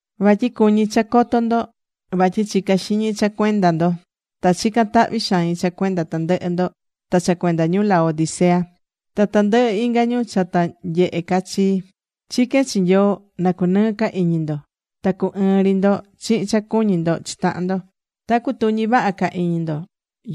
Vatyi cuñí cha coto ndo vatyi chicá xiñi cha cuenda ndo. Ta chicán tahvi xain cha cuenda tandɨhɨ ndo ta cha cuenda ñu Laodicea, ta tandɨhɨ inga ñu cha ta nyehe ca chii. Chiquén chi Nyoo na cunɨɨ ca iñi ndo, ta cu ɨɨn ri ndo chihin cha cuñí ndo chi tahan ndo. Ta cutuñi vaha ca iñi ndo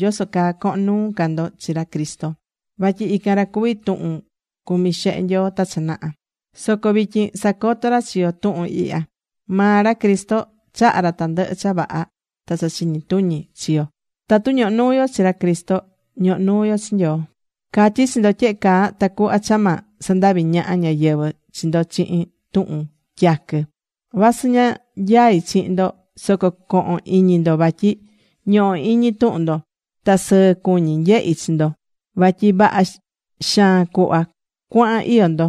yoso caa cohon nuu ca ndo chi ra Cristo. Vatyi ican ra cuví tuhun cumi̱ xehe Nyoo ta cha naha. Soco vityin sacotó ra chi yo tuhun ihya. Maa ra Cristo chahá ra tandɨhɨ cha vaha ta cha chiñi tuñi chi yo. Tatu ñohó nuu yo chi ra Cristo, ñohó nuu yo chi Nyoo. Catyí chi ndo tyehe caa tacuhva cha ma sandavi ñaha ñáyɨvɨ chi ndo chihin tuhun tyaquɨ. Vasɨ ña nyaí chihin ndo, soco cohon iñi ndo vatyi ñohó iñi tuhun ndo. Ta sɨɨ cuñí nyehi chi ndo. Vatyi vaha xaan cuhva cuahán iyó ndo.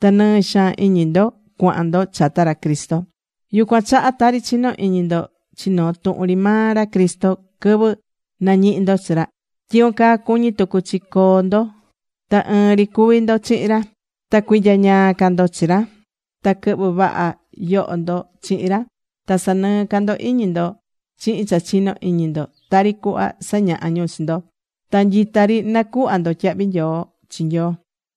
Ta nɨɨ xaan iñi ndo cuahan ndo chata ra Cristo. Yucuan chaha tari chinó iñi ndo chi noo tuhun ri maa ra Cristo quɨvɨ nañihi̱ ndo chi ra, tyicuan caa cuñí tucu chi coo ndo ta ɨɨn ri cuvi ndo chihin ra. Ta cuinyañaa ca ndo chi ra. Ta quɨhɨ vaha yoho ndo chihin ra. Ta sanɨɨ ca ndo iñi ndo chihin cha chino iñi ndo, tari cuhva sañaha ñu chi ndo. Ta nyita ri nacuhvá ndo tyahvi nyoo chi Nyoo.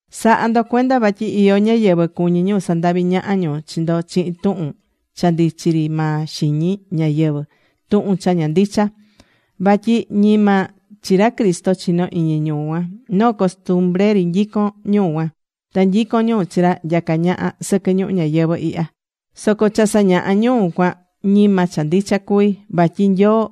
Sa̱ha ndo cuenda vatyi iyó ñáyɨvɨ cuñí ñu sandavi ñaha ñu chi ndo chihin tuhun cha ndichí ri maa xiñi ñáyɨvɨ, tuhun cha ña ndicha. Vatyi ñima chi ra Cristo chinó iñi ñu cuan. Noo costumbre ri nyicón ñu cuan. Ta nyicón ñu chi cha nyacá ñaha sɨquɨ ñuhu ñayɨvɨ̱ ihya. Soco cha sañahá ñu cuan, ñima cha ndicha cuví. Vatyi Nyoo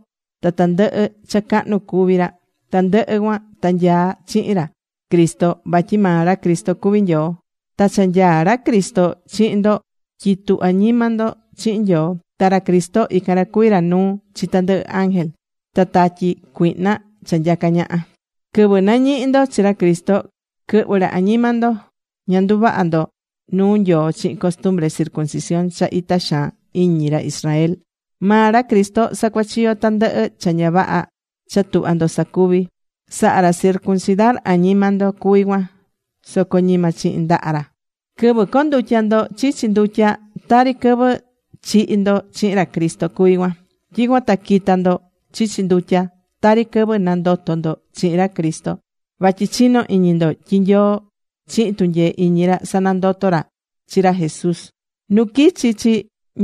ta tandɨhɨ cha cahnu cuví ra, tandɨhɨ cuan ta nyaá chihin ra Cristo. Vatyi maa ra Cristo cuví Nyoo. Ta cha nyaá ra Cristo chihin ndo, tyitú añima ndo chihin Nyoo. Ta ra Cristo ican ra cuví ra nuu chi tandɨhɨ ángel ta tatyi cuihna cha nyacá ñaha. Quɨvɨ nañihi̱ ndo chi ra Cristo, quɨhvɨ̱ ra añima ndo. Ña nduvaha̱ ndo nuu Nyoo chihin costumbre circuncisión cha itá xaan iñi ra Israel. Maa ra Cristo sacuachiyo̱ tandɨhɨ cha ña vaha cha tuhva̱ ndo sacuvi̱. Saha̱ ra circuncidar añima ndo cuví cuan soco ñima chihin ndaha ra. Quɨvɨ condutya̱ ndo chichi ndutya, tari quɨvɨ chihi̱ ndo chihin ra Cristo cuví cuan. Tyicuan ta quita̱ ndo chichi ndutya, tari quɨvɨ nandoto̱ ndo chihin ra Cristo, vatyi chinó iñi ndo tyi Nyoo chihin tunyee iñi ra sanandoto̱ ra chi ra Jesús. Nu quichi̱ chi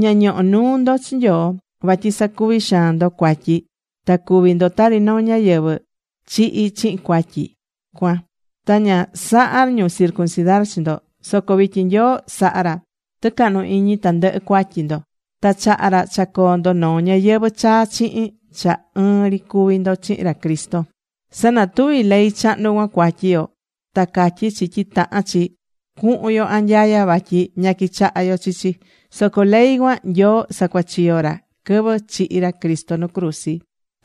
ña ñoho̱ nuu ndo chi Nyoo. Vatyi sacuvi̱ xaan ndo cuatyi. Ta cuvi̱ ndo tari noo ñáyɨvɨ chihí chihin cuatyi cuan. Ta ña saha̱ ñu circuncidar chi ndo. Soco vityin Nyoo saha̱ ra tɨcahnu iñi tandɨhɨ cuatyi ndo. Ta chaha̱ ra cha coo ndo noo ñayɨvɨ̱ chaa chihin cha ɨɨn ri cuví ndo chihin ra Cristo. Sanatuví ley chahnu cuan cuatyi yo. Ta catyí chi tyi tahán chi cuhun yo anyaya vatyi ña quichahá yo chi chi. Soco ley cuan Nyoo sacuachiyo̱ ra quɨvɨ chihi̱ ra Cristo nu cruzi.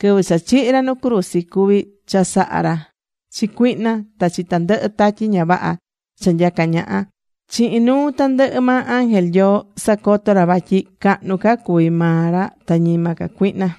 Quɨvɨ cha chihi̱ ra nu cruzi cuvi̱ chasaha ra chi cuihna ta chi tandɨhɨ tatyi ña vaha cha nyacá ñaha. Chihin nuu tandɨhɨ maa ángel Nyoo sacotó ra vatyi cahnu ca cuví maa ra ta ñima ca cuihna.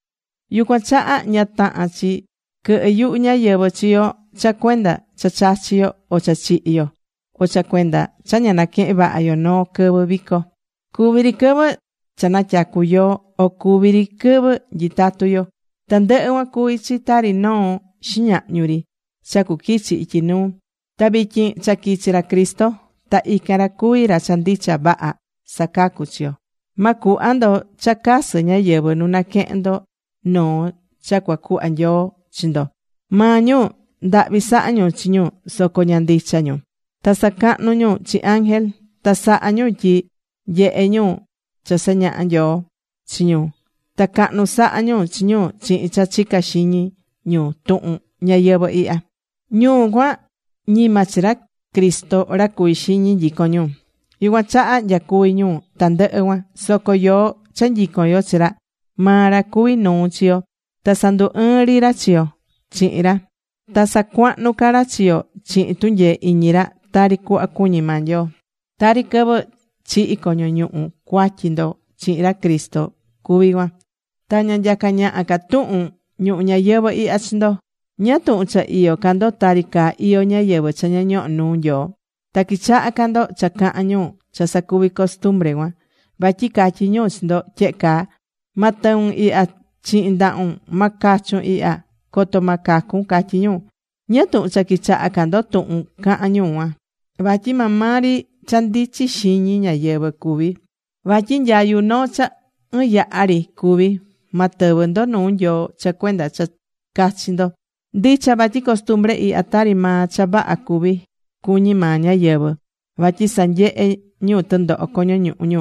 Yucuan chaha ña tahán chi quɨhɨ́ yuhu ñáyɨvɨ chi yo cha cuenda cha chachí yo o cha chihí yo, o cha cuenda cha ña naquehén vaha yo noo quɨvɨ vico. Cuví ri quɨvɨ cha natyacu yoo, o cuví ri quɨvɨ nyitatu yo. Tandɨhɨ cuan cuví chi tari noo xiñahñu ri cha cuquichi ityi nuu. Ta vityin cha quichi̱ ra Cristo ta ican ra cuví ra cha ndicha vaha sacacu chi yo. Ma cuhva ndo cha casɨ ñáyɨvɨ nu naquehen ndo noo cha cuacuhva Nyoo chi ndo. Maa ñu ndahvi sahá ñu chi ñu soco ña ndicha ñu, ta sacahnú ñu chi ángel. Ta sahá ñu tyi ñyehe ñu cha sañaha Nyoo chi ñu. Ta cahnu sahá ñu chi ñu chihin cha chicá xiñi ñu tuhun ñayɨvɨ̱ ihya. Ñu cuan ñima chi ra Cristo ra cuví xiñi nyicón ñu. Yucuan chaha nyacuví ñu tandɨhɨ cuan. Soco yoó cha nyicón yo chi ra, maa ra cuví nuu chi yo. Ta sandu ɨɨ́n ri ra chi yo chihin ra. Ta sacuahnú ca ra chi yo chihin tunyee iñi ra tari cuhva cuñí maa Nyoo. Tari quɨvɨ chihi̱ coño ñuhu cuatyi ndo chihin ra Cristo cuví cuan. Ta ña nyacá ñaha ca tuhun ñuhu ñayɨvɨ̱ ihya chi ndo. ¿Ñáá tuhun cha iyó ca ndo tari caa iyó ñáyɨvɨ cha ña ñohó nuu Nyoo? Ta quichahá ca ndo cha cahán ñu cha sacuví costumbre cuan. Vatyi catyí ñu chi ndo tyehe caa: “Ma tɨun ihya chihin ndahun, ma cachun ihya. Coto ma cacun”, catyí ñu. ¿Ñáá tuhun cha quichahá ca ndo tuhun cahán ñu cuan? Vatyi maa maa ri cha ndichí xiñi ñáyɨvɨ cuví. Vatyi nyayu noo cha ɨɨn yaha ri cuví. Ma tɨvɨ ndo nuu Nyoo cha cuenda cha cachi ndo. Ndicha vatyi costumbre ihya tari maa cha vaha cuví, cuñí maa ñáyɨvɨ. Vatyi sanyehé ñu tɨndoho coño ñuhu ñu.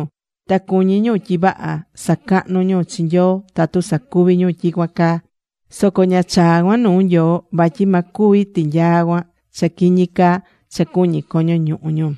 Ta cuñí ñu tyi vaha sacahnú ñu chi Nyoo tatu sacuví ñu tyicuan caa. Soco ña chaá cuan nuu Nyoo. Vatyi ma cuvi tinyaa cuan cha quiñi caa cha cuñí coño ñuhu ñu.